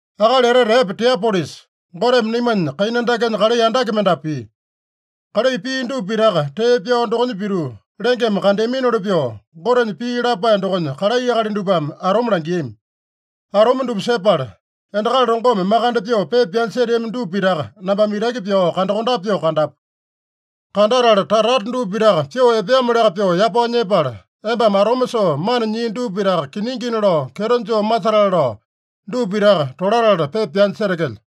Akali etete epe Tiopilusa, Goteme naimanya kaina dakenya kalai andake mendapu pia. Kalai pia dupa pitaka tee pyao dokonya pituu lengeme kandeaminoli pyoo, Gotenya pii lapae dokonya kalai akali dupame atome langiami. Atome dupa sepala, endakali longome makande pyoo pepa pyanya seteami dupa pitaka nambame itaki pyao kandakondape pyoo kandapu. Kandatala tata-tata dupa pitaka pyoo epeamoliaka pyoo yapao nyepala, embame atome soo mana nyii dupa pitaka kiningina lao kyeto joo masetale lao, dupa pitaka tolatala pepa pyanya setekelyo.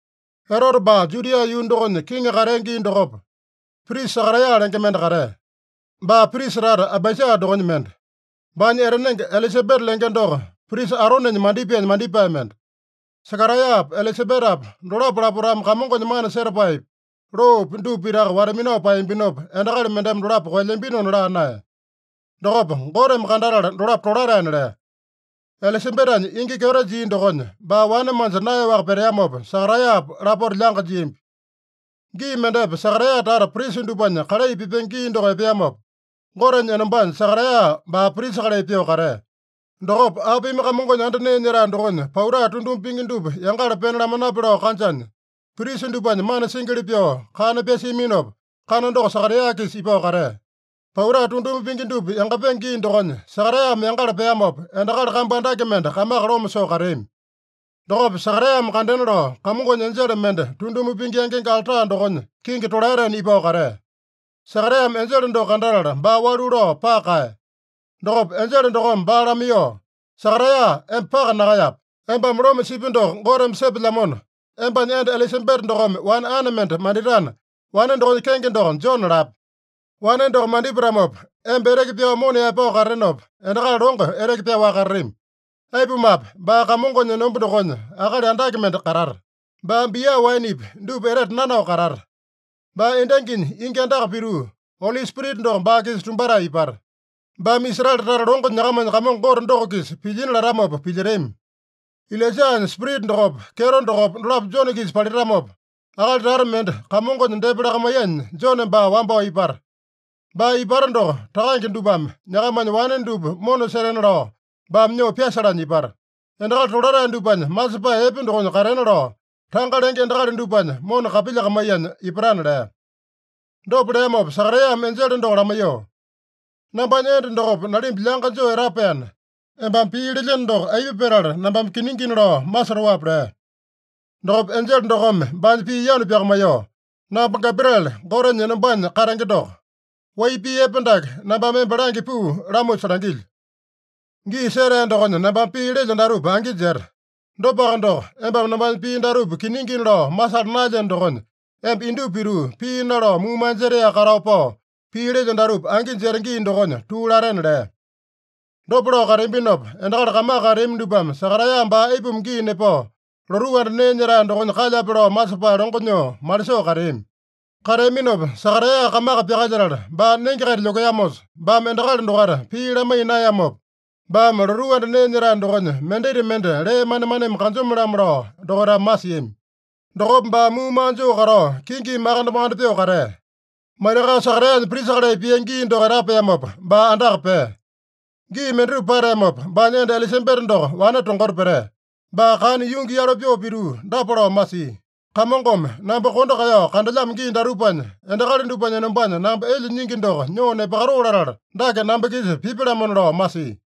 Erote baa Judia yuu dokonya kiŋi katea gii dokopa, prisa Sakaraeya lenge mende katea. Baa prisa tata Abaija dokonya mende. Baanya etanenge Elisabeta lenge doko, prisa Aronenya mandipaenya mandipae mende. Sakaraeyapa, Elisabetapa dolapo lapotame Kamongonya mana setapaepi, loopi dupa pitaka wata-minao paeyambinopa, endakali mendeme dolapo koelyambinona laa naeya. Dokopa Goteme kandatala dolapo tolataena lea. Elisabetanya ingi kyeto jia dokonya, baa wane manja naeyaowaka peteamopa, Sakaraeyapa lapota lyanga jiambi. Gii mendepa Sakaraeya tata prisa dupanya kalai pipenge gii doko epeamopa, Gotenya enombanya Sakaraeya baa prisa kalai pyoo katea. Dokopa apimi Kamongonya anda nee nyetae dokonya pauta tunduma pingi dupa yangala pena lamanape lao kanjanya, prisa dupanya mana singili pyoo kana pyasiaminopa, kana doko Sakaraeya-kisa ipao katea. Pauta tunduma pingi dupa yangapenge gii dokonya Sakaraeyame yangala peamopa, endakali kambu andake mende kamaka loma soo kateami. Dokopa Sakaraeyame kandena lao, Kamongonya enjele mende tunduma pingi yangenge alta dokonya kingi tolaetena ipao katea. Sakaraeyame enjele doko kandatala baa walu lao paka kaeya. Dokopa enjele dokome baa lamaiyoo, “Sakaraeya, emba paka nakaeyape. Embame loma sipi doko Goteme sepelyamona, embanya enda Elisabeta dokome wane ane mende manditana, wane dokonya kenge doko Jone lape. Wane doko mandipatamopa, emba eteke pyao mona yaepao katatenopa, endakali longo eteke pyaowaka katatami. Aipumape, baa Kamongonya enomba dokonya akali andake mende katata. Baa bia waenepi dupa etete nanao katata. Baa endanginya ingi andaka pituu, Oli Spirita doko baa-kisa tumbatae ipata. Baame Israele tata longo nyakamanya Kamongo Gote doko-kisa pilyina latamopa pilyetami. Ilaijanya spirita dokopa, kyeto dokopa dolapo Jone-kisa palitamopa, akali tata mende Kamongonya depa lakamaiyanya Jone baa wambao ipata. Baa ipata doko, takange dupame nyakamanya wane dupa mona setena lao baame nyoo pyasalanya ipata. Endakali tolatae dupanya masepae epe dokonya katena lao, tanga lenge endakali dupanya mona kapilyakamaiyanya ipatana” lea. Dopa leamopa Sakaraeyame enjele doko lamaiyoo, “Nambanya enda dokopa nalimba lyanga joo etapaena, embame pii lelyeno doko aipa petala nambame kiningina lao masotoape?” lea. Dokopa enjele dokome baanya pii yanu pyakamaiyoo, “Namba Gabriele, Gotenya enombanya katenge doko. Wai pii epe dake nambame emba langya puu lamusa langilyo. Gii setea dokonya nambame pii lelyo datupa angi jeta. Dopaka doko, embame nambanya pii datupa kiningina lao masala naelyeno dokonya, emba indupa pituu, pii nalao muumaa jetaeyaka katao pao, pii lelyo datupa angi jeta gii dokonya tuu latena” lea. Dopa lao kateambinopa, endakali kamaka kateami dupame Sakaraeya baa aipuma gii nepao, lotuu anda nee nyetae dokonya kalyape lao masepae longo nyoo malisoo kateami. Kateaminopa Sakaraeya kamaka pyakalyetala, baa nenge-kaita lyokeamosa, baame endakali dokaita pii lamaiya naeyamopa, baame lotuu anda nee nyetae dokonya mendita mende lee manemaneme kanjome-lamo lao dokaitame masiami. Dokopa baa muumaa joo katao, kingimi makande-makande pyoo katea. Maitakao Sakaraeyanya prisa kalai pia gii doko etapeamopa, baa andaka pea. Gii mendatupa pateamopa, baanya enda Elisabeta doko wane tongota petea. Baa kana yungi yalo pyoo pituu dapa lao masia: “Kamongome namba kondo kaeyao kandelyamo gii datupanya, endakali dupanya enombanya namba elya nyingi doko nyoo nepakatoo latala, dake namba-kisa pipya-lamona” lao masia.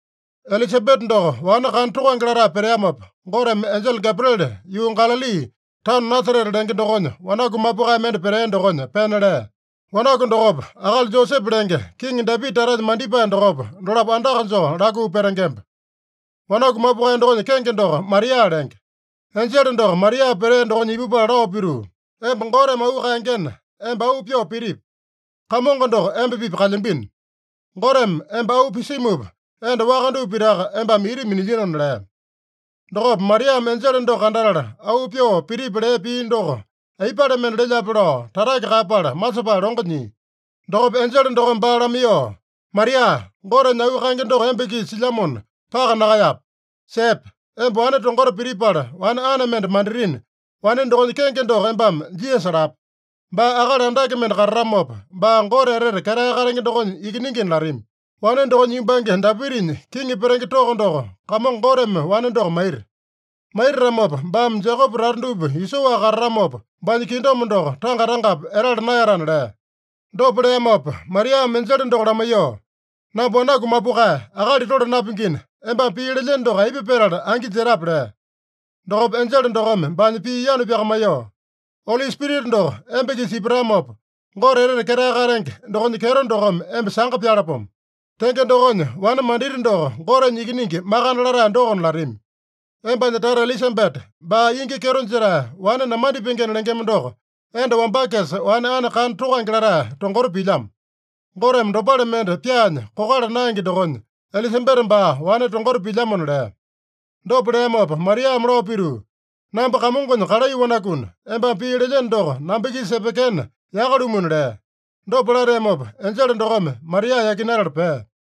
Elisabeta doko wane kana tokange latae peteamopa, Goteme enjele Gabriele yuu Galali, taono Nasarete lenge dokonya, wanaku mapukae mende petea dokonya pena lea. Wanaku dokopa, akali Josepe lenge, Kiŋi Dapita tatanya mandipae dokopa, dolapo andaka joo lakuu petengemba. Wanaku mapukae dokonya kenge doko Maria lenge. Enjele doko Maria petea dokonya ipupala lao pituu, “Emba Goteme auu kaengena, emba auu pyoo pitipi. Kamongo doko emba-pipa kalyambino. Goteme emba auu pisimupa, enda waka dupa pitaka embame ita minilyinona” lea. Dokopa Mariame enjele doko kandatala, auu pyoo pitipi lea pii doko aipale mende lelyape lao tatake kaeyapala masepae longo nyia. Dokopa enjele dokome baa lamaiyoo, “Maria, Gotenya auu kaenge doko emba-kisa silyamona, paka nakaeyape. Sepe! Emba wane tongota pitipala, wane ane mende manditina, wane dokonya kenge doko embame Jisasa lape. Baa akali andake mende katatamopa, baa Gote Etete Ketae Katenge dokonya Ikiningina latami. Wane dokonya yumbange Dapitanya kiŋi petenge toko doko Kamongo Goteme wane doko maita. Maitatamopa, baame Jekope tata dupa isoaka katatamopa, baanya kingdom doko tanga-tangapi etala naeyatana” lea. Dopa leamopa Mariame enjele doko lamaiyoo, “Namba wanaku mapukae, akali tole napingina, embame pii lelyeno doko aipa petala angi jetape?” lea. Dokopa enjele dokome baanya pii yanu pyakamaiyoo, “Oli Spirita doko emba-kisa ipatamopa, Gote Etete Ketae Katenge dokonya kyeto dokome emba sanga pyalapomo. Tenge dokonya, wane manditi doko Gotenya Ikiningi Makande Latae dokona latami. Embanya tata Elisabeta, baa ingi kyeto jetae, wane namandipengena lengema doko, enda wambakesa wane ane kana tokange latae tongota pilyamo. Goteme dopale mende pyaanya kokala naenge dokonya, Elisabeta baa wane tongota pilyamona” lea. Dopa leamopa Mariame lao pituu, “Namba Kamongonya kalai wanakuna, embame pii lelyeno doko namba-kisa epekena yaka-lumuna” lea. Dopa lateamopa enjele dokome Maria yakinatala pea.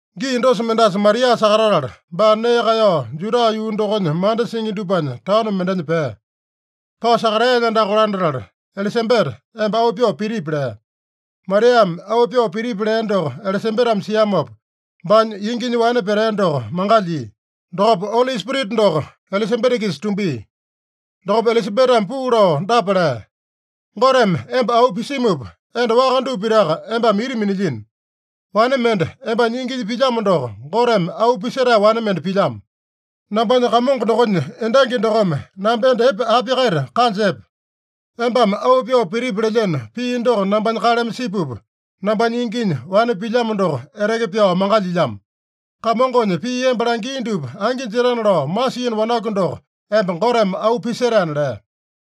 Gii dosa mendasa Maria sakatatala, baa nee kaeyao Juda yuu dokonya manda singi dupanya taono mendenya pea. Pao Sakaraeyanya andaka kolandatala, “Elisabeta, emba auu pyoo pitipi” lea. Mariame auu pyoo pitipi lea doko Elisabetame siamopa, baanya inginya wane petea doko mangalyia. Dokopa Oli Spirita doko Elisabeta-kisa tumbia. Dokopa Elisabetame puu lao dapa lea: “Goteme emba auu pisimupa, enda waka dupa pitaka embame ita minilyino. Wane mende embanya inginya pilyamo doko, Goteme auu pisetae wane mende pilyamo. Nambanya Kamongo dokonya endangi dokome namba enda epe api-kaita kanja epe? Embame auu pyoo pitipi lelyeno pii doko nambanya kaleme sipupa, nambanya inginya wane pilyamo doko eteke pyao mangalyilyamo. Kamongonya pii emba langia dupa angi jetana lao masiino wanaku doko emba Goteme auu pisetaena” lea.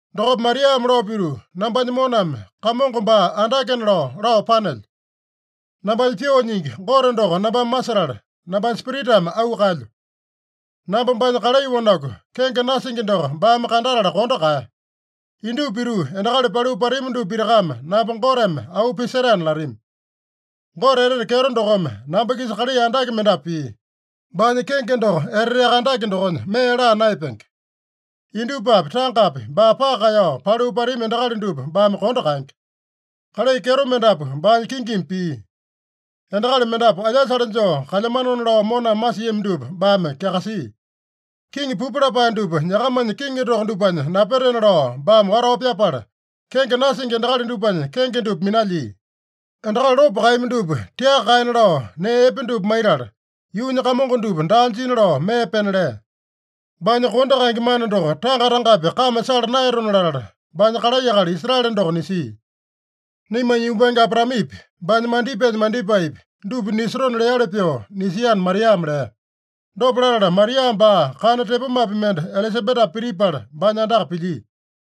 Dokopa Mariame lao pituu, “Nambanya moname Kamongo baa andakena lao, lao panelyo. Nambanya pyoo nyingi Gote doko nambame masetala, nambanya spiritame auu kaelyo. Namba baanya kalai wanaku, kenge nasingi doko baame kandatala kondo kaeya. Indupa pituu endakali paliu patami dupa pitakame namba Goteme auu pisetaena latami. Gote etete kyeto dokome namba-kisa kalai andake mendapu pia. Baanya kenge doko eteteaka andake dokonya, mee laa naeyapenge. Indupapi, tangapi baa paka kaeyao, paliu pelyami endakali dupa baame kondo kaenge. Kalai kyeto mendapu baanya kingimi pia. Endakali mendapu alyasale joo kalyamanona lao moname masiami dupa baame kyakasia. Kiŋi pupu lapae dupa nyakamanya kiŋi toko dupanya napetena lao baame watao pyapala, kenge nasingi endakali dupanya kenge dupa minalyia. Endakali lopo kaeyami dupa tiaka kaena lao nee epe dupa maitala, yuunya kamongo dupa daa jina lao mee pena lea. Baanya kondo kaenge mana doko tanga-tangapi kame sala naeyatona latala, baanya kalai akali Israele doko nisia. Naimanya yumbange Abraamepi, baanya mandipaenya mandipaepi, dupa nisotona leali pyoo nisiana” Mariame lea. Dopa latala, Maria baa kana tepomapi mende Elisabetapa pitipala, baanya andaka pilyia.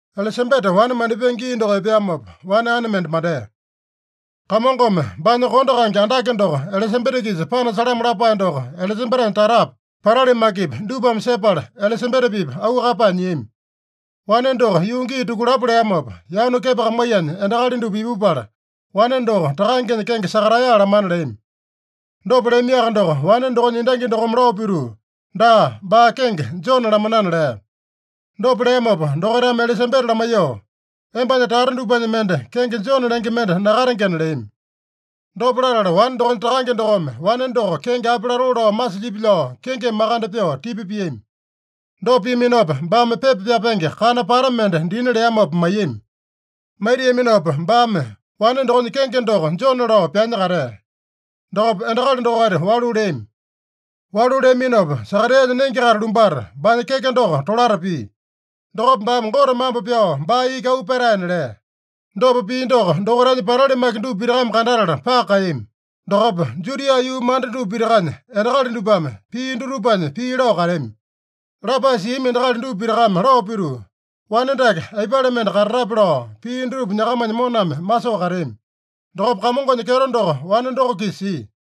Elisabeta wane mandipenge gii doko epeamopa, wane ane mende mandea. Kamongome baanya kondo kaenge andake doko Elisabeta-kisa panasalamo lapae doko Elisabetanya tatapi, patali makipi dupame sepala, Elisabeta-pipa auu kaeyapae nyiami. Wane doko yuu gii tukulapo leamopa, yanu kepakamaiyanya endakali dupa ipupala, wane doko takangenya kenge Sakaraeya lamana leami. Dopa leamiaka doko, wane dokonya endangi dokome lao pituu, “Daa, baa kenge Jone lamanana” lea. Dopa leamopa dokaitame Elisabeta lamaiyoo, “Embanya tata dupanya mende kenge Jone lenge mende nakatengena” leami. Dopa latala wane dokonya takange dokome wane doko kenge api latoo lao masilyipi lao kingimi makande pyoo tipa piami. Dopa piaminopa, baame pepa pyapenge kana pata mende dina leamopa maiyami. Maitiaminopa baame, “Wane dokonya kenge doko Jone” lao pyanya katea. Dokopa endakali dokaita walu leami. Walu leaminopa, Sakaraeyanya nenge-kaita lumbata, baanya keke doko tolata pia. Dokopa baame Gote mambo pyao baa iki auu petaena lea. Dopa pia doko, dokaitanya patali maki dupa pitakame kandatala paka kaeyami. Dokopa Judia yuu manda dupa pitakanya endakali dupame pia dutupanya pii lao kateami. Lapae siami endakali dupa pitakame lao pituu, “Wane dake aipale mende katatape” lao, pia dutupa nyakamanya moname masoo kateami. Dokopa Kamongonya kyeto doko wane doko-kisa sia.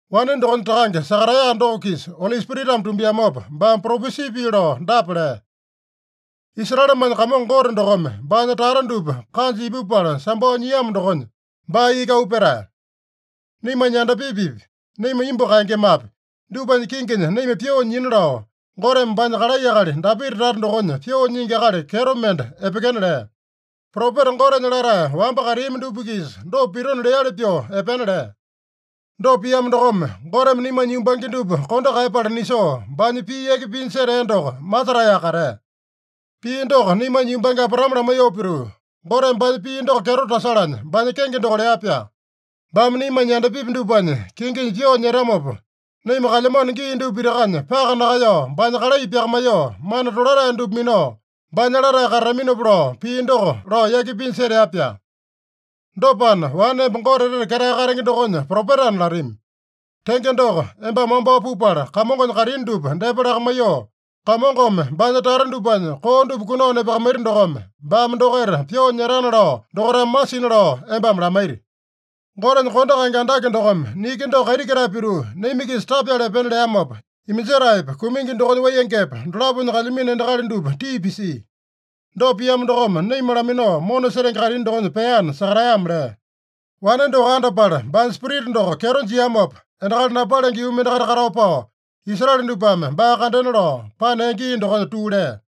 Wane dokonya takange Sakaraeya doko-kisa Oli Spiritame tumbiamopa, baame propesi pii lao dapa lea: “Israelemanya Kamongo Gote dokome baanya tata dupa kanja ipupala sambao nyiamo dokonya, baa iki auu petae. Naimanya yandapipipi, naima imbu kaengemapi, dupanya kinginya naima pyoo nyina lao, Goteme baanya kalai akali Dapita tata dokonya pyoo nyingi akali kyeto mende epekena lea. Propeta Gotenya latae wamba kateami dupa-kisa dopa pitona leali pyoo epena lea. Dopa piamo dokome, Goteme naimanya yumbange dupa kondo kaeyapala nisoo, baanya pii yaki pinya setea doko masetaeyaka katea. Pii doko naimanya yumbange Abraame lamaiyoo pituu, Goteme baanya pii doko kyeto tasalanya, baanya kenge doko lea-pyaa. Baame naimanya yandapipi dupanya kinginya pyoo nyetamopa, naima kalyamano gii dupa pitakanya paka nakaeyao baanya kalai pyakamaiyoo, mana tolatae dupa minao, baanya latae katataminopa lao pii doko lao yaki pinya setea-pyaa. Dopana, wane emba Gote Etete Ketae Katenge dokonya propetana latami. Tenge doko, embame wambao pupala, Kamongonya kaitini dupa depa lakamaiyoo, Kamongome baanya tata dupanya koo dupa kunao nepakamaita dokome, baame dokaita pyoo nyetana lao dokaitame masina lao embame lamaiti. Gotenya kondo kaenge andake dokome niki doko kaiti ketae pituu naima-kisa tapyala epena leamopa, iminjetaepa, kumingi dokonya waiyengepa, dolaponya kalyamino endakali dupa tii pisia. Dopa piamo dokome naima laminao mona setenge kaitini dokonya peana” Sakaraeyame lea. Wane doko andapala, baanya spirita doko kyeto jiamopa, endakali napalenge yuu mendakaita katao pao, Israele dupame baa kandena lao panea gii dokonya tuu lea.